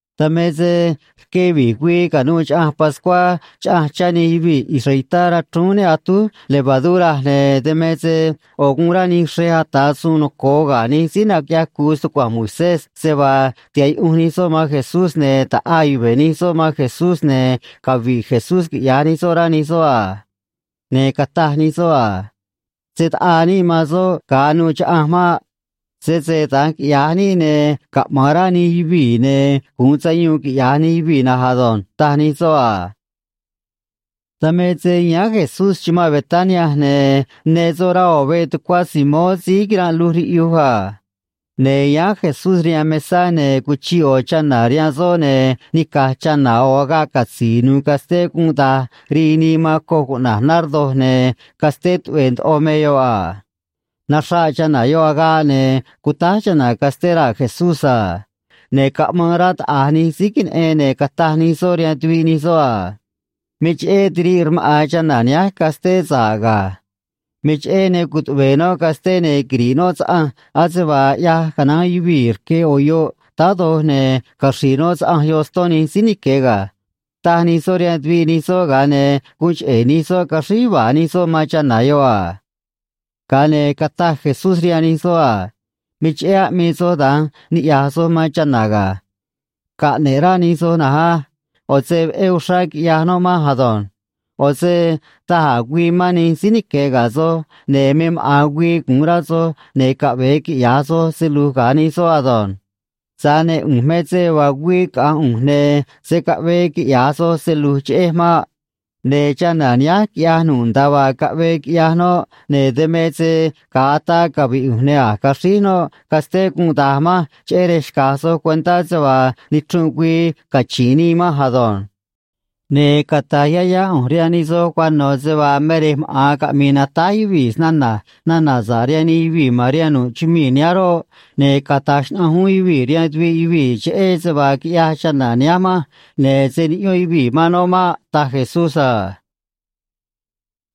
Dan me se rque vi̱j güii ca̱nuû Chaꞌanj Pascuá chaꞌanj chá nij yuvii̱ israelitá rachrúún ne atúj levadura, ne̱ dan me se ꞌo̱ guun rá nij xrej ata̱ suun noco̱o ga̱ nij síí naquiꞌyaj cu̱u stucua̱nj Moisés se vaa tiha̱ꞌ yuꞌunj nij soꞌ man Jesús, ne̱ ta̱ꞌaa yuve̱ nij soꞌ man Jesús, ne̱ cavi̱ꞌ Jesús, quiꞌya̱j nij soꞌ, rá nij soꞌ a. Ne̱ cataj nij soꞌ a: ―Se̱ taꞌaa níꞌ man soꞌ ga̱a anuû chaꞌanj maꞌ. Sese da̱nj quiꞌya̱j níꞌ, ne̱ caꞌma̱an rá nij yuvii̱, ne̱ gu̱un sayuun, quiꞌya̱j nij yuvii̱ na̱nj ado̱nj ―taj nij soꞌ a. Dan me se yáán Jesús chumanꞌ Betania, ne̱ ne soꞌ rá ꞌo̱ veꞌ tucuá Simón síí quiranꞌ luj riꞌyuj a. Ne̱ yáán Jesús rihaan mesá, ne̱ cuchiꞌ ꞌo̱ chana̱ rihaan soꞌ, ne̱ nica̱j chana̱ ꞌo̱ agaꞌ catzi̱i̱ nu̱u̱ casté gunꞌ da̱j rii nii man coj cuꞌna̱j nardo, ne̱ casté tuꞌve̱e̱ ndoꞌo me yoꞌ a. Naxraꞌ chana̱ yoꞌ agaꞌ, ne̱ cutáj chana̱ casté raa̱ Jesús a. Ne̱ caꞌmaan rá taꞌa̱j nij síí queneꞌen, ne̱ cataj nij soꞌ rihaan tuviꞌ nij soꞌ a: ―Me cheꞌé tiriꞌ rmaꞌa̱n chana̱ nihánj casté sa̱ꞌ ga̱. Me cheꞌé ne cutuꞌve̱e̱ noꞌ casté, ne̱ quiri̱ꞌ noꞌ saꞌanj ase vaa ꞌyaj canaán yuvii̱ rque ꞌo̱ yoꞌ táá doj, ne̱ caxri̱i̱ noꞌ saꞌanj yoꞌ ston nij síí nique̱ ga̱ ―taj nij soꞌ rihaan tuviꞌ nij soꞌ, ga̱a ne̱ guun cheꞌe̱ nij soꞌ caxríj yuva̱a̱ nij soꞌ man chana̱ yoꞌ a. Ga̱a ne̱ cataj Jesús rihaan nij soꞌ a: ―Me cheꞌé aꞌmii soj da̱nj niꞌya̱j soj man chana̱ ga̱. Caꞌne̱ꞌ rá nij soj na̱nj á. ꞌO̱ se veꞌé uxrá quiꞌyaj noꞌ manj ado̱nj. ꞌO̱ se da̱j a̱ güii mán nij síí nique̱ ga̱ soj, ne̱ me maꞌa̱n güii gu̱un rá soj, ne̱ caꞌve̱e quiꞌya̱j soj se lu̱j ga̱ nij soꞌ ado̱nj. Tza̱j ne̱ ꞌu̱nj me se vaa güii caꞌa̱nj ꞌu̱nj, ne̱ se̱ caꞌvee quiꞌya̱j soj se lu̱j cheꞌej maꞌ. Ne̱ chana̱ nihánj quiꞌyaj nu̱ꞌ nda̱a vaa caꞌvee quiꞌyaj noꞌ, ne̱ dan me se ga̱a ataa cavi̱ꞌ ꞌu̱nj ne̱ a̱j caxríj noꞌ casté gunꞌ da̱j manj cheꞌé rej xca̱j soj cuentá se vaa nichrunꞌ güii cachi̱nꞌ nii manj ado̱nj. Ne̱ cata̱j yá yá ꞌu̱nj rihaan nij soj cuano̱ se vaa me rej maꞌa̱n caꞌmi̱i̱ natáj yuvii̱ snana̱j nana̱ sa̱ꞌ rihaan nij yuvii̱ ma̱n rihaan nu̱ꞌ chumii̱ nihánj roꞌ, ne̱ cata̱j xnaꞌanj uún yuvii̱ rihaan tuviꞌ yuvii̱ cheꞌé se vaa quiꞌyaj chana̱ nihánj manj, ne̱ se̱ niꞌyón yuvii̱ man noꞌ maꞌ ―taj Jesús a.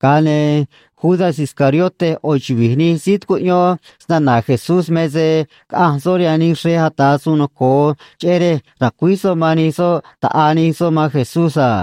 Ga̱a ne̱ Judas Iscariote ꞌo̱ chuvi̱j nij síí tucuꞌyón snana̱ Jesús me se caꞌanj soꞌ rihaan nij xrej ata̱ suun noco̱o, cheꞌé rej ra̱cuíj soꞌ man nij soꞌ ta̱ꞌaa nij soꞌ man Jesús a.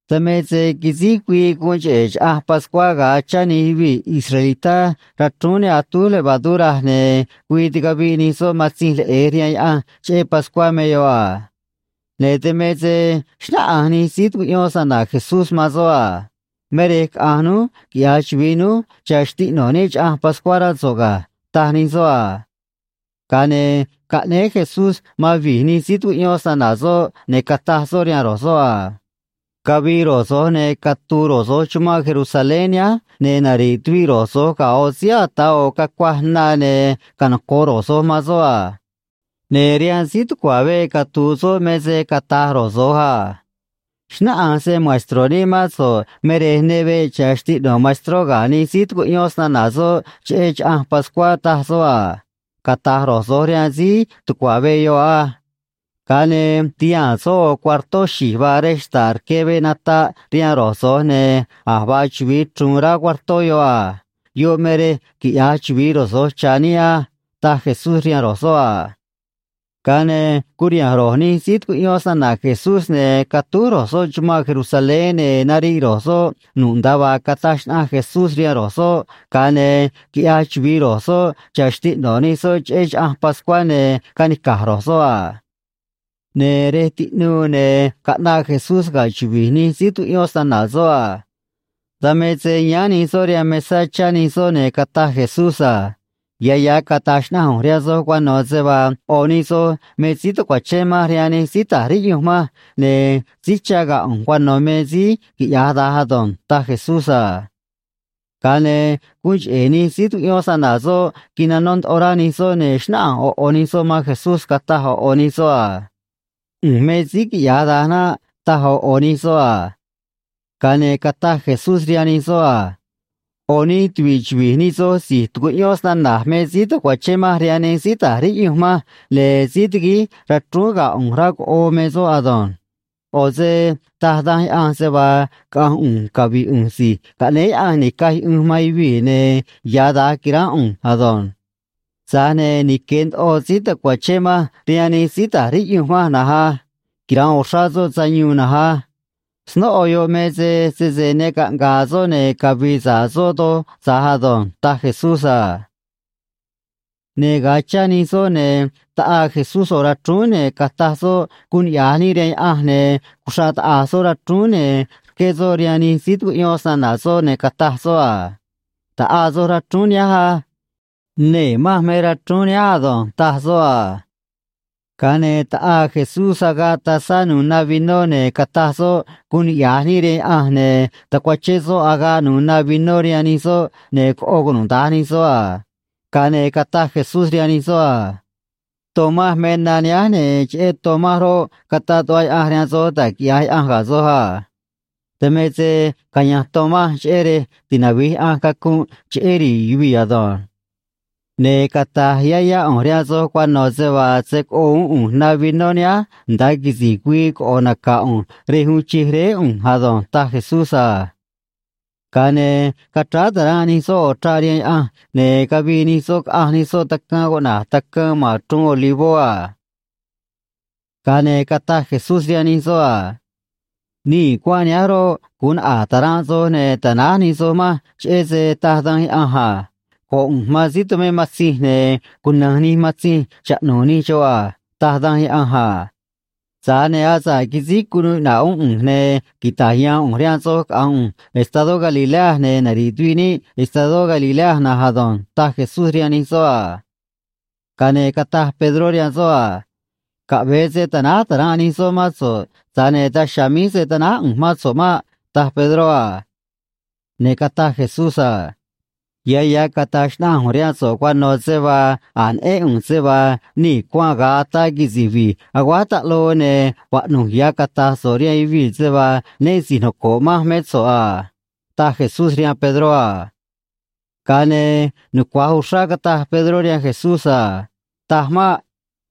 Dan me se quisíj güii guun cheꞌe̱ Chaꞌanj Pascuá ga̱a chá nij yuvii̱ israelitá rachrúún ne atúj levadura, ne̱ güii ticaviꞌ nij soꞌ matzinj leꞌe̱j rihaan Yaꞌanj cheꞌé Pascuá me yoꞌ a. Ne̱ dan me se xnáꞌanj nij síí tucuꞌyón snana̱ Jesús man soꞌ a: ―Me rej caꞌa̱nj núj quiꞌya̱j chuvi̱i núj cha̱ xtiꞌno̱ níꞌ Chaꞌanj Pascuá, rá so̱ꞌ ga̱ ―taj nij soꞌ a. Ga̱a ne̱ caꞌnéé Jesús man vi̱j nij síí tucuꞌyón snana̱ soꞌ, ne̱ cataj soꞌ rihaan ro̱j soꞌ a: ―Cavi̱i̱ ro̱j so̱j, ne̱ catu̱u̱ ro̱j so̱j chumanꞌ Jerusalén nihánj, ne̱ nari̱ꞌ tuviꞌ ro̱j so̱j ga̱ ꞌo̱ síí ata̱ ꞌo̱ cacuaj na, ne̱ canoco̱ꞌ ro̱j so̱j man soꞌ a. Ne̱ rihaan síí tucua̱ veꞌ catu̱u̱ soꞌ me se cata̱j ro̱j so̱j a: “Xnáꞌanj se‑maestro̱ níꞌ mán so̱ꞌ me rej ne veꞌ cha̱ xtiꞌno̱ maestró ga̱ nij síí tucuꞌyón snana̱ soꞌ cheꞌé Chaꞌanj Pascuá, taj soꞌ a”, cata̱j ro̱j so̱j rihaan síí tucua̱ veꞌ yoꞌ á. Ga̱a ne̱ ti̱haa̱n soꞌ ꞌo̱ cuartó xi̱j vaa rej xta̱ꞌ rque veꞌ nataꞌ rihaan ro̱j so̱j, ne̱ a̱j vaa chuvi̱i chruun rá cuartó yoꞌ a. Yoꞌ me rej quiꞌya̱j chuvi̱i ro̱j so̱j cha̱ níꞌ á ―taj Jesús rihaan ro̱j soꞌ a. Ga̱a ne̱ curiha̱nj ro̱j nij síí tucuꞌyón snana̱ Jesús, ne̱ catúj ro̱j soꞌ chumanꞌ Jerusalén, ne̱ nariꞌ ro̱j soꞌ nu̱ꞌ nda̱a vaa cataj xnaꞌanj Jesús rihaan ro̱j soꞌ, ga̱a ne̱ quiꞌyaj chuvi̱i ro̱j soꞌ cha̱ xtiꞌno̱ nij soꞌ cheꞌé Chaꞌanj Pascuá, ne̱ canica̱j ro̱j soꞌ a. Ne̱ rej tiꞌnuu, ne̱ caꞌnaꞌ Jesús ga̱ chuvi̱j nij síí tucuꞌyón snana̱ soꞌ a. Dan me se yáán nij soꞌ rihaan mesá, chá nij soꞌ, ne̱ cataj Jesús a: ―Ya̱ ya̱ cata̱j xnaꞌanj ꞌu̱nj rihaan soj cuano̱ se vaa ꞌo̱ nij soj me síí ta̱cuachén manj rihaan nij síí ta̱j riꞌyunj manj, ne̱ síí chá ga̱ ꞌu̱nj cuano̱ me síí quiꞌya̱j da̱nj ado̱nj ―taj Jesús a. Ga̱a ne̱ guun cheꞌe̱ nij síí tucuꞌyón snana̱ soꞌ quinanó ndoꞌo rá nij soꞌ, ne̱ xnáꞌanj ꞌo̱ ꞌo̱ nij soꞌ man Jesús, cataj ꞌo̱ ꞌo̱ nij soꞌ a: ―ꞌU̱nj me síí quiꞌya̱j da̱nj naꞌ ―taj ꞌo̱ ꞌo̱ nij soꞌ a. Ga̱a ne̱ cataj Jesús rihaan nij soꞌ a: ―ꞌO̱ nij tuvi̱ꞌ chuvi̱j nij soj si̱j tucuꞌyón snana̱j me síí ta̱cuachén manj rihaan nij síí ta̱j riꞌyunj manj, ne̱ síí tiguíj rachrúún ga̱ ꞌu̱nj rá coꞌoo me soꞌ ado̱nj. ꞌO̱ se taj Danj Yaꞌanj se vaa caꞌa̱nj ꞌu̱nj cavi̱ꞌ ꞌu̱nj Si̱j Caꞌnéé Yaꞌanj Ni̱caj Yuꞌunj man Yuvii̱, ne̱ ya̱ da̱nj qui̱ránꞌ ꞌu̱nj ado̱nj. Tza̱j ne̱ nique̱ ndoꞌo síí ta̱cuachén manj rihaan nij síí ta̱j riꞌyunj manj na̱nj á. Quira̱nꞌ uxrá soꞌ sayuun na̱nj á. Snóꞌo yoꞌ me se sese ne caꞌnga̱a̱ soꞌ, ne̱ cavii sa̱ꞌ soꞌ doj tza̱j ado̱nj ―taj Jesús a. Ne̱ ga̱a chá nij soꞌ, ne̱ taꞌaa Jesús ꞌo̱ rachrúún, ne̱ cataj soꞌ guun niꞌya̱j níꞌ rihaan Yaꞌanj, ne̱ cuxraꞌ taꞌa̱j soꞌ rachrúún, ne̱ rqué soꞌ rihaan nij síí tucuꞌyón snana̱ soꞌ, ne̱ cataj soꞌ a: ―Ta̱ꞌaa soj rachrúún nihánj á. Nee̱ manj me rachrúún nihánj ado̱nj ―taj soꞌ a. Ga̱a ne̱ taꞌaa Jesús agaꞌ tazá nu̱u̱ na vinó, ne̱ cataj soꞌ guun niꞌya̱j níꞌ rihaan Yaꞌanj, ne̱ tacuachén soꞌ agaꞌ nu̱u̱ na vinó rihaan nij soꞌ, ne̱ coꞌo cunuda̱nj nij soꞌ a. Ga̱a ne̱ cataj Jesús rihaan nij soꞌ a: ―Ton manj me na nihánj, ne̱ cheꞌé ton manj roꞌ, cataꞌ tuꞌva Yaꞌanj rihaan soj da̱j quiꞌya̱j Yaꞌanj ga̱ soj a. Dan me se caya̱nj ton manj cheꞌé rej tinavi̱j Yaꞌanj cacunꞌ cheꞌé ri̱i̱ yuvii̱ ado̱nj. Ne̱ cata̱j yá yá ꞌu̱nj rihaan soj cuano̱ se vaa se̱ coꞌo uún ꞌu̱nj na vinó nihánj nda̱a quisi̱j güii coꞌo̱ naca̱ ꞌu̱nj rej uun chij Réé ꞌu̱nj ado̱nj ―taj Jesús a. Ga̱a ne̱ cachráá ta̱ranꞌ nij soꞌ ꞌo̱ chraꞌ rihaan Yaꞌanj, ne̱ cavii nij soꞌ, caꞌanj nij soꞌ tacaan cuꞌna̱j Tacaan ma̱n Chruun Olivó a. Ga̱a ne̱ cataj Jesús rihaan nij soꞌ a: ―Nii̱ cuanꞌ nihánj roꞌ, gu̱un naꞌa̱j ta̱ranꞌ soj ne̱ ta̱náj nij soj manj, cheꞌé se taj danj Yaꞌanj a: “Go̱ꞌ ꞌu̱nj man síí tumé matzinj, ne̱ cuna̱nj nij matzinj chaꞌnu̱u̱ nij xoꞌ a”, taj Danj Yaꞌanj a. Tza̱j ne̱ asa̱ꞌ quisíj cunuu iꞌna̱ꞌ uún ꞌu̱nj, ne̱ quita̱j ya̱a̱n ꞌu̱nj rihaan soj caꞌa̱nj ꞌu̱nj estadó Galilea, ne̱ nari̱ꞌ tuviꞌ níꞌ estadó Galilea na̱nj ado̱nj ―taj Jesús rihaan nij soꞌ a. Ga̱a ne̱ cataj Pedró rihaan soꞌ a: ―Caꞌve̱e se ta̱náj ta̱ranꞌ nij soꞌ mán so̱ꞌ, tza̱j ne̱ daj chiha̱a̱ míj se̱ tanáj ꞌu̱nj mán so̱ꞌ maꞌ ―taj Pedró a. Ne̱ cataj Jesús a: ―Ya̱ ya̱ cata̱j xnaꞌanj ꞌu̱nj rihaan so̱ꞌ cuano̱ se vaa a̱j neꞌén ꞌu̱nj se vaa nii̱ cuanꞌ ga̱a ataa quisi̱j vi̱j aguáj taꞌloo, ne̱ vaꞌnu̱j ya̱ cata̱j so̱ꞌ rihaan yuvii̱ se vaa né si̱j noco̱ꞌ manj mé so̱ꞌ a ―taj Jesús rihaan Pedró a. Ga̱a ne̱ nucua̱j uxrá cataj Pedró rihaan Jesús a: ―Taj maꞌ.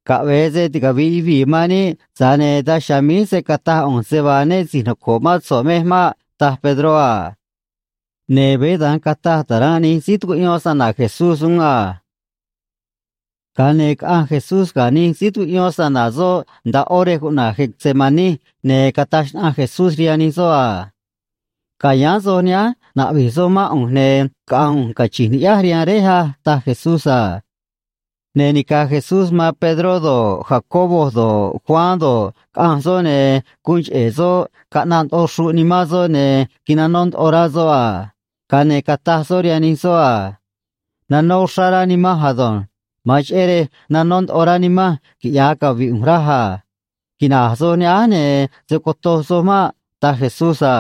Caꞌve̱e se ticavi̱ꞌ yuvii̱ man níꞌ, tza̱j ne̱ daj chiha̱a̱ míj se̱ cataj ꞌu̱nj se vaa né si̱j noco̱ꞌ mán so̱ꞌ mej maꞌ ―taj Pedró a. Ne̱ veé da̱nj cataj ta̱ranꞌ nij síí tucuꞌyón snana̱ Jesús uún a. Ga̱a ne̱ caꞌanj Jesús ga̱ nij síí tucuꞌyón snana̱ soꞌ nda̱a ꞌó rej cuꞌna̱j Getsemaní, ne̱ cataj xnaꞌanj Jesús rihaan nij soꞌ a: ―Ca̱yáán soj nihánj, na̱ꞌvi̱j soj mán ꞌu̱nj, ne̱ caꞌa̱nj ꞌu̱nj, cachi̱nj ni̱ꞌyáj rihaan Réj a ―taj Jesús a. Ne̱ nica̱j Jesús man Pedró do̱ꞌ, Jacobo do̱ꞌ, Juan do̱ꞌ, caꞌanj soꞌ, ne̱ guun cheꞌe̱ soꞌ caꞌnaꞌ ndoꞌo xruꞌ nimán soꞌ ne̱ quinanó ndoꞌo rá soꞌ a. Ga̱a ne̱ cataj soꞌ rihaan nij soꞌ a: ―Nanó uxrá rá nimanj ado̱nj. Ma̱an cheꞌé rej nanó ndoꞌo rá nimanj, quiꞌya̱j cavi̱ꞌ ꞌu̱nj, raj a. Quina̱j soj nihánj, ne̱ se̱ cotoj soj maꞌ ―taj Jesús a.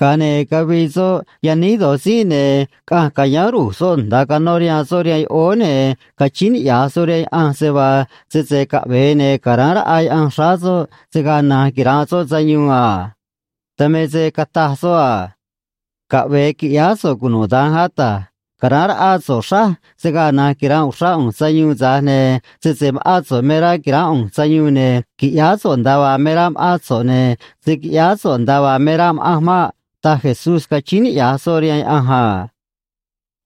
Ga̱a ne̱ cavii soꞌ yaníj do̱j tzínꞌ, ne̱ caꞌanj ca̱yáán ru̱j soꞌ nda̱a canó rihaan soꞌ rihaan yoꞌóó, ne̱ cachíín niꞌya̱j soꞌ rihaan Yaꞌanj se vaa sese caꞌve̱e, ne̱ ca̱ráán raꞌa Yaꞌanj xráá soꞌ, se̱ gaa na̱nj quira̱nꞌ soꞌ sayuun a. Dan me se cataj soꞌ a: ―Caꞌve̱e qui̱ꞌyáá so̱ꞌ cunuda̱nj, Ata̱j. Ca̱ráán raꞌá so̱ꞌ xráj, se̱ gaa na̱nj quira̱nꞌ uxrá ꞌu̱nj sayuun, tza̱j ne̱ sese ma̱ꞌán so̱ꞌ me rá qui̱ránꞌ ꞌu̱nj sayuun, ne̱ qui̱ꞌyáá so̱ꞌ nda̱a vaa me rá ma̱ꞌán so̱ꞌ, ne̱ se̱ quiꞌyáá so̱ꞌ nda̱a vaa me rá ma̱ꞌanj maꞌ ―taj Jesús, cachíín niꞌya̱j soꞌ rihaan Yaꞌanj a.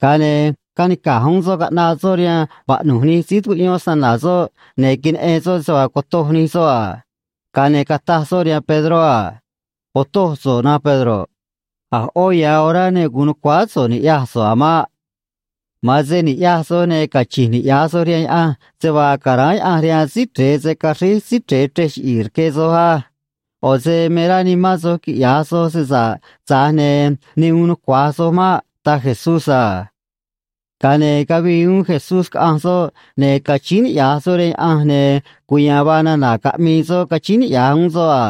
Ga̱a ne̱ canica̱j uún soꞌ caꞌnaꞌ soꞌ rihaan vaꞌnu̱j nij síí tucuꞌyón snana̱ soꞌ, ne̱ queneꞌen soꞌ se vaa cotoj nij soꞌ a. Ga̱a ne̱ cataj soꞌ rihaan Pedró a: ―Otoj so̱ꞌ, na̱nj Pedro. A̱ ꞌó ya̱ orá ne gu̱un nu̱cuáá so̱ꞌ ni̱ꞌyaj so̱ꞌ a̱ maꞌ. Ma̱an se ni̱ꞌyaj soj, ne̱ cachi̱nj niꞌya̱j soj rihaan Yaꞌanj se vaa ca̱ráán Yaꞌanj rihaan Síí Chre̱e se̱ caxríj Síí Chre̱e chrej chiꞌi̱i̱ rque soj á. ꞌO̱ se me rá nimán soj quiꞌya̱j soj se sa̱ꞌ, tza̱j ne̱ ne uun nucua̱j soj maꞌ ―taj Jesús a. Ga̱a ne̱ cavii uún Jesús, caꞌanj soꞌ, ne̱ cachíín niꞌya̱j soꞌ rihaan Yaꞌanj, ne̱ cuya̱a̱n vaa nana̱ caꞌmii soꞌ cachíín niꞌya̱j uún soꞌ a.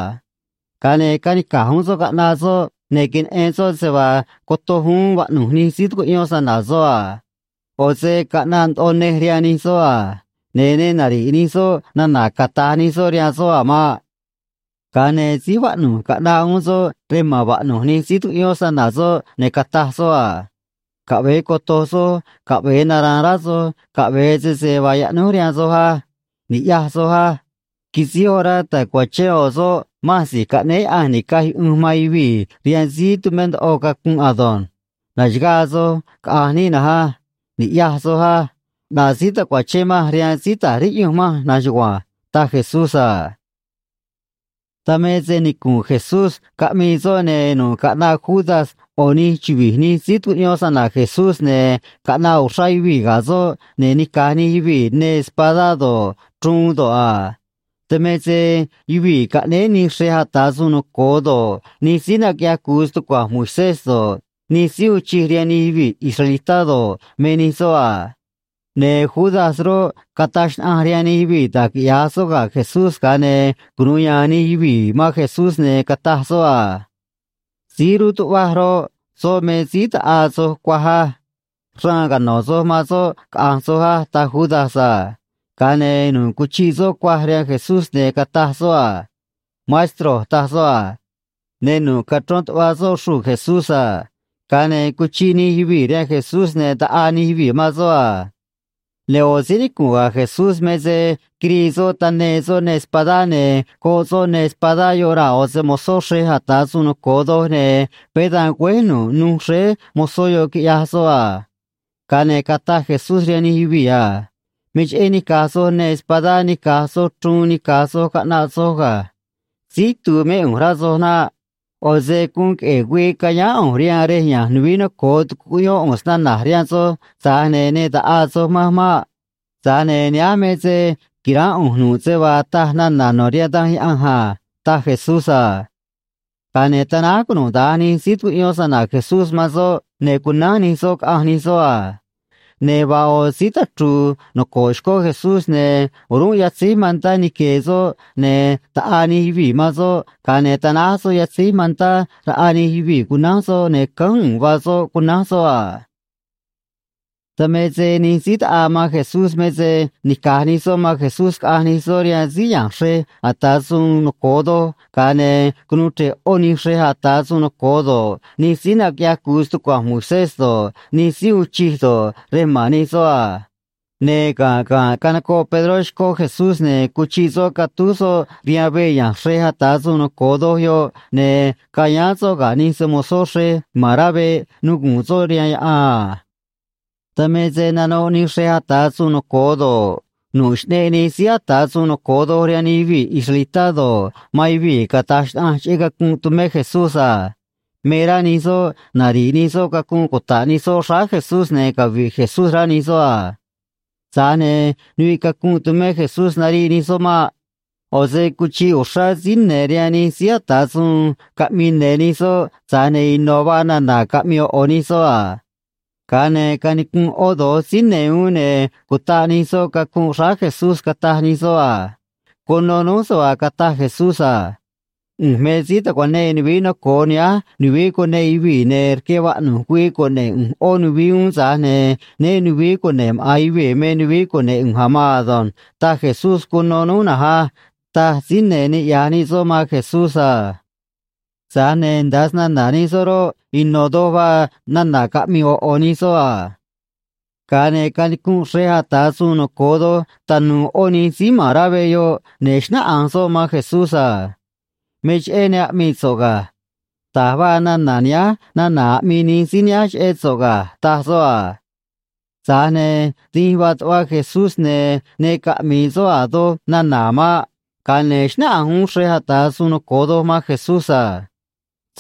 Ga̱a ne̱ canica̱j uún soꞌ caꞌnaꞌ soꞌ, ne̱ queneꞌen soꞌ se vaa cotoj uún vaꞌnu̱j nij síí tucuꞌyón snana̱ soꞌ a. ꞌO̱ se caꞌnaꞌ ndoꞌo nej rihaan nij soꞌ a. Ne̱ ne nari̱ꞌ nij soꞌ nana̱ cata̱j nij soꞌ rihaan soꞌ a̱ maꞌ. Ga̱a ne̱ síj vaꞌnu̱j caꞌnaꞌ uún soꞌ rej ma̱n vaꞌnu̱j nij síí tucuꞌyón snana̱ soꞌ, ne̱ cataj soꞌ a: ―Caꞌve̱e coto̱j soj caꞌve̱e nara̱a̱n rá soj caꞌve̱e sese vaa yaꞌnúj rihaan soj á. Ni̱ꞌyaj soj á. Quisíj orá ta̱cuachén ꞌo̱ soꞌ manj Si̱j Caꞌnéé Yaꞌanj Ni̱caj Yuꞌunj man Yuvii̱ rihaan síí tumé ndoꞌo cacunꞌ ado̱nj. Na̱xagaa soj, caꞌa̱nj níꞌ na̱nj á. Ni̱ꞌyaj soj á. ꞌNaꞌ síí ta̱cuachén manj rihaan síí ta̱j riꞌyunj manj na̱nj chugua̱nj ―taj Jesús a. Dan me se nicu̱nꞌ Jesús caꞌmii soꞌ, ne̱ nu̱ꞌ caꞌnaꞌ Judas ꞌo̱ nij chuvi̱j nij síí tucuꞌyón snana̱ Jesús, ne̱ caꞌnaꞌ uxrá yuvii̱ ga̱ soꞌ, ne̱ nica̱j nij yuvii̱ neê espadá do̱ꞌ, chruun do̱ꞌ a. Dan me se yuvii̱ caꞌnéé nij xrej ata̱ suun noco̱o do̱ꞌ, nij síí naquiꞌyaj cu̱u stucua̱nj Moisés do̱ꞌ, nij síí uun chij rihaan nij yuvii̱ israelitá do̱ꞌ, me nij soꞌ a. Ne̱ Judas roꞌ, cataj xnaꞌanj rihaan nij yuvii̱ da̱j quiꞌya̱j soꞌ ga̱ Jesús, ga̱a ne̱ cunu̱u ya̱a̱n nij yuvii̱ man Jesús, ne̱ cataj soꞌ a: ―Síí ru̱tuꞌvaj roꞌ, soꞌ me síí ta̱ꞌaa soj cuaj á. Raan cano̱ soj man soꞌ, caꞌa̱nj soj á ―taj Judas a. Ga̱a ne̱ nu̱ꞌ cuchiꞌ soꞌ cuaj rihaan Jesús, ne̱ cataj soꞌ a: ―Maestro ―taj soꞌ a. Ne̱ nu̱ꞌ cachrón tuꞌva̱ soꞌ xruu̱ Jesús a. Ga̱a ne̱ cuchiꞌ nij yuvii̱ rihaan Jesús, ne̱ taꞌaa nij yuvii̱ man soꞌ a. Ne̱ ꞌo̱ síí nicu̱nꞌ ga̱ Jesús me se quirii soꞌ taneê soꞌ neê espadá, ne̱ goꞌ soꞌ neê espadá yoꞌ raa̱ ꞌo̱ se‑mo̱zó xrej ata̱ suun noco̱o doj, ne̱ veé dan güéj nu̱ꞌ nuj xréé mozó yoꞌ, quiꞌyaj soꞌ a. Ga̱a ne̱ cataj Jesús rihaan nij yuvii̱ a: ―Me cheꞌé nica̱j soj neê espadá nica̱j soj chruun nica̱j soj, caꞌnaꞌ soj ga̱. Síí itu̱u̱ mé ꞌu̱nj, rá soj naꞌ. ꞌO̱ se guun queꞌe̱e̱ güii cayáán ꞌu̱nj rihaan rej ya̱nj nuvií noco̱o, tucuꞌyón ꞌu̱nj snana̱j rihaan soj, tza̱j ne̱ ne ta̱ꞌaa soj manj maꞌ. Tza̱j ne̱ nihánj me se qui̱ránꞌ ꞌu̱nj nu̱ꞌ se vaa taj nana̱ no̱ rihaan Danj Yaꞌanj a ―taj Jesús a. Ga̱a ne̱ tanáj cunuda̱nj nij síí tucuꞌyón snana̱ Jesús man soꞌ, ne̱ cunánj nij soꞌ, caꞌanj nij soꞌ a. Ne̱ vaa ꞌo̱ síí tachru̱u̱ noco̱ꞌ xcó Jesús, ne̱ o̱rúnꞌ yatzéj mantá nique̱e̱ soꞌ, ne̱ taꞌaa nij yuvii̱ man soꞌ, ga̱a ne̱ tanáj soꞌ yatzéj mantá raꞌa nij yuvii̱, cunánj soꞌ, ne̱ cánj u̱u̱n vaa soꞌ, cunánj soꞌ a. Dan me se nij síí taꞌaa man Jesús me se nica̱j nij soꞌ man Jesús caꞌanj nij soꞌ rihaan síí ya̱nj xrej ata̱ suun noco̱o doj, ga̱a ne̱ cunuu chre̱ꞌ ꞌó nij xrej ata̱ suun noco̱o do̱ꞌ, nij síí naquiꞌyaj cu̱u stucua̱nj Moisés do̱ꞌ, nij síí uun chij do̱ꞌ, rej ma̱n nij soꞌ a. Ne̱ ga̱nꞌ ga̱nꞌ canocoꞌ Pedró xcó Jesús, ne̱ cuchiꞌ soꞌ catúj soꞌ rihaan veꞌ ya̱nj xrej ata̱ suun noco̱o doj yoꞌ, ne̱ cayáán soꞌ ga̱ nij se‑mo̱zó xrej ma̱n rá veꞌ, nuguu̱n soꞌ rihaan yaꞌan a. Dan me se nanoꞌ nij xrej ata̱ suun noco̱o do̱ꞌ, nu̱ꞌ Xꞌneꞌ Nij Síí Ata̱ Suun Noco̱o Doj rihaan nij yuvii̱ israelitá do̱ꞌ, man yuvii̱ cata̱j xnaꞌanj cheꞌé cacunꞌ tumé Jesús a. Me rá nij soꞌ nari̱ꞌ nij soꞌ cacunꞌ cuta̱ꞌ nij soꞌ xráá Jesús, ne̱ cavi̱ꞌ Jesús, rá nij soꞌ a. Tza̱j ne̱ nuviꞌ cacunꞌ tumé Jesús nariꞌ nij soꞌ maꞌ. ꞌO̱ se cuchiꞌ uxrá síí ne̱ rihaan nij síí ata̱ suun caꞌmii ne̱ nij soꞌ, tza̱j ne̱ ino̱ vaa nana̱ caꞌmii ꞌo̱ ꞌo̱ nij soꞌ a. Ga̱a ne̱ canicunꞌ ꞌó do̱j síí ne̱ uún, ne̱ cutaꞌ nij soꞌ cacunꞌ xráá Jesús, cataj nij soꞌ a: ―Cuno núj se vaa cataj Jesús a: “ꞌU̱nj me síí ta̱cuanee nuvií noco̱o nihánj nuvií cuneꞌ yuvii̱, ne̱ rque vaꞌnu̱j güii cune̱ꞌ ꞌu̱nj ꞌó nuvií uún, tza̱j ne̱ né nu̱vií cune̱ꞌ maꞌa̱n yuvii̱ me nuvií cune̱ꞌ ꞌu̱nj a̱ maan ado̱nj”, taj Jesús cuno núj na̱nj á ―taj síí ne̱ niꞌya̱j nij soꞌ man Jesús a. Tza̱j ne̱ nda̱a snana̱ nij soꞌ roꞌ, ino̱ do̱j vaa nana̱ caꞌmii ꞌo̱ ꞌo̱ nij soꞌ a. Ga̱a ne̱ canicunꞌ xrej ata̱ suun noco̱o doj tanu̱u̱ ꞌó nij síí ma̱n rá veꞌ yoꞌ, ne̱ xnáꞌanj soꞌ man Jesús a: ―Me cheꞌé ne aꞌmii so̱ꞌ ga̱. Da̱j vaa nana̱ nihánj nana̱ aꞌmii nij síí nihánj cheꞌé so̱ꞌ ga̱ ―taj soꞌ a. Tza̱j ne̱ dínj vaa tuꞌva Jesús, ne̱ ne caꞌmi̱i̱ soꞌ a̱ doj nana̱ a̱ maꞌ. Ga̱a ne̱ xnáꞌanj uún xrej ata̱ suun noco̱o doj man Jesús a: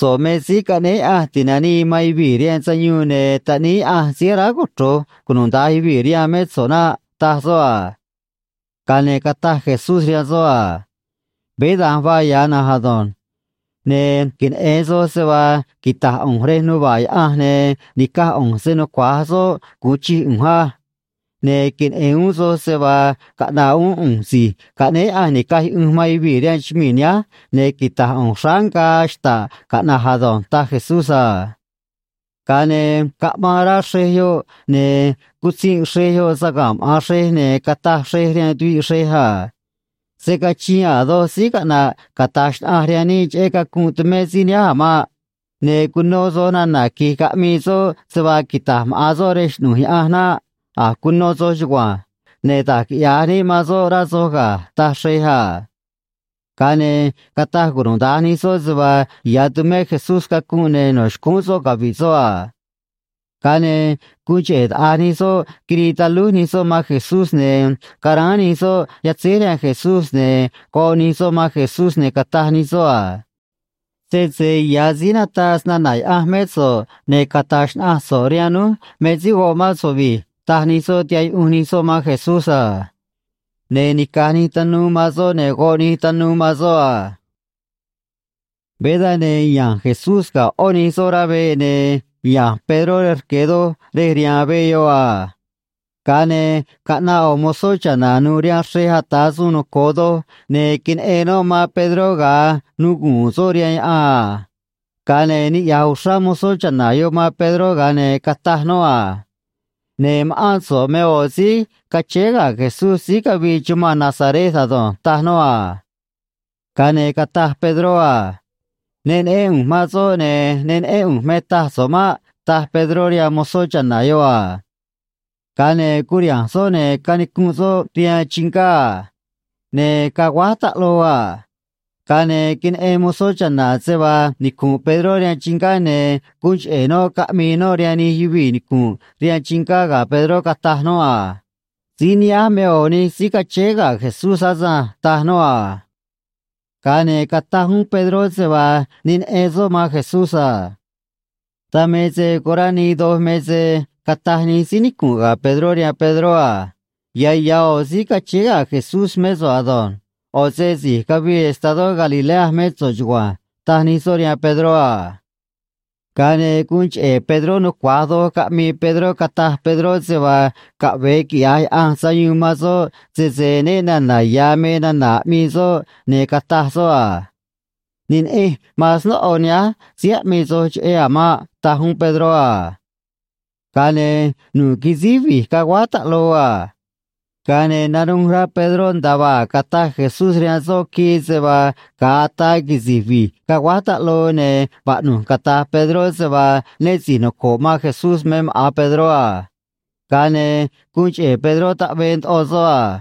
―So̱ꞌ me Síí Caꞌnéé Yaꞌanj Ti̱nanii man Yuvii̱ rihaan Sayuun, ne̱ Taꞌníí Yaꞌanj síí aráj cochro̱j cunuda̱nj yuvii̱ rihaan mé so̱ꞌ naꞌ ―taj soꞌ a. Ga̱a ne̱ cataj Jesús rihaan soꞌ a: ―Veé da̱nj vaa ya̱ na̱nj ado̱nj. Ne̱ queneꞌe̱n soj se vaa quita̱j ꞌu̱nj rej nuva̱ꞌ Yaꞌanj ne̱ ni̱caj ꞌu̱nj se‑nucua̱j soꞌ gu̱un chij ꞌu̱nj á. Ne̱ queneꞌe̱n uún soj se vaa caꞌna̱ꞌ uún ꞌu̱nj Si̱j Caꞌnéé Yaꞌanj Ni̱caj Yuꞌunj man Yuvii̱ rihaan chumii̱ nihánj, ne̱ quita̱j ꞌu̱nj xráá ngaa xta̱ꞌ caꞌna̱j ado̱nj ―taj Jesús a. Ga̱a ne̱ caꞌmaan rá xrej yoꞌ, ne̱ cutzinꞌ xrej yoꞌ saga̱nꞌ maꞌa̱n xrej, ne̱ cataj xrej rihaan tuviꞌ xrej a: ―Se̱ cachiin a̱ doj síí caꞌna̱ꞌ cata̱j xnaꞌanj rihaan níꞌ cheꞌé cacunꞌ tumé síí nihánj a̱ maꞌ. Ne̱ cuno soj nana̱ qui̱j caꞌmii soꞌ se vaa quita̱j maꞌa̱n soꞌ rej xꞌnu̱j Yaꞌanj naꞌ. A̱j cuno soj chugua̱nj. Ne̱ da̱j quiꞌya̱j níꞌ man soꞌ, rá soj ga̱ ―taj xrej a. Ga̱a ne̱ cataj cunuda̱nj nij soꞌ se vaa ya̱ tumé Jesús cacunꞌ, ne̱ no̱ xcúún soꞌ cavi̱ꞌ soꞌ a. Ga̱a ne̱ guun cheꞌe̱ taꞌa̱j nij soꞌ quirii talúj nij soꞌ man Jesús, ne̱ caráán nij soꞌ yatzéj rihaan Jesús, ne̱ goꞌ nij soꞌ man Jesús, ne̱ cataj nij soꞌ a: ―Sese ya̱ síí nataꞌ snana̱ Yaꞌanj mé so̱ꞌ, ne̱ cata̱j xnaꞌanj so̱ꞌ rihaan núj me síí goꞌ mán so̱ꞌ vi̱j ―taj nij soꞌ, tihaꞌ yuꞌunj nij soꞌ man Jesús a. Ne̱ nica̱j nij tanuu man soꞌ, ne̱ goꞌ nij tanuu man soꞌ a. Veé dan, ne̱ ya̱nj Jesús ga̱ ꞌó nij soꞌ rá veꞌ, ne̱ ya̱nj Pedró rej rque̱ doj rej rihaan veꞌ yoꞌ a. Ga̱a ne̱ caꞌnaꞌ ꞌo̱ mozó cha̱na̱ nu̱u̱ rihaan xrej ata̱ suun noco̱o doj, ne̱ queneꞌen noꞌ man Pedró ga̱a nuguu̱n soꞌ rihaan yaꞌan a. Ga̱a ne̱ niꞌya̱j uxrá mozó cha̱na̱ yoꞌ man Pedró, ga̱a ne̱ cataj noꞌ a: ―Ne̱ ma̱ꞌán so̱ꞌ me ꞌo̱ síí cachéé ga̱ Jesús síí cavii chumanꞌ Nazaret ado̱nj ―taj noꞌ a. Ga̱a ne̱ cataj Pedró a: ―Ne neꞌén ꞌu̱nj man soꞌ, ne̱ ne neꞌén ꞌu̱nj me taj so̱ꞌ maꞌ ―taj Pedró rihaan mozó cha̱na̱ yoꞌ a. Ga̱a ne̱ curiha̱nj soꞌ, ne̱ canicunꞌ soꞌ rihaan chingá a. Ne̱ caguáj taꞌloo a. Ga̱a ne̱ queneꞌen mozó cha̱na̱ se vaa nicu̱nꞌ Pedró rihaan chingá, ne̱ guun cheꞌe̱ noꞌ caꞌmii noꞌ rihaan nij yuvii̱ nicu̱nꞌ rihaan chingá ga̱ Pedró, cataj noꞌ a: ―Síí nihánj me ꞌo̱ nij síí cachéé ga̱ Jesús asânj ―taj noꞌ a. Ga̱a ne̱ cataj uún Pedró se vaa ne neꞌen soꞌ man Jesús a. Dan me se corá nii doj me se cataj nij síí nicu̱nꞌ ga̱ Pedró rihaan Pedró a: ―Ya̱ ya̱ ꞌo̱ síí cachéé ga̱ Jesús mé so̱ꞌ ado̱nj. ꞌO̱ se si̱j cavii estadó Galilea mé so̱ꞌ chugua̱nj ―taj nij soꞌ rihaan Pedró a. Ga̱a ne̱ guun cheꞌe̱ Pedró nucua̱j doj caꞌmii Pedró, cataj Pedró se vaa caꞌve̱e quiꞌya̱j Yaꞌanj sayuun man soꞌ sese né na̱na̱ ya̱ me nana̱ aꞌmii soꞌ, ne̱ cataj soꞌ a: ―Ne neꞌenj man snóꞌo nihánj síí aꞌmii soj cheꞌé a̱ maꞌ ―taj uún Pedró a. Ga̱a ne̱ nu̱ꞌ quisíj vi̱j caguáj taꞌloo a. Ga̱a ne̱ nanuj rá Pedró nda̱a vaa a̱j cataj Jesús rihaan soꞌ quii se vaa ga̱a ataa quisi̱j vi̱j caguáj taꞌloo, ne̱ vaꞌnu̱j cata̱j Pedró se vaa né si̱j noco̱ꞌ man Jesús me maꞌa̱n Pedró a. Ga̱a ne̱ guun cheꞌe̱ Pedró taꞌvee ndoꞌo soꞌ a.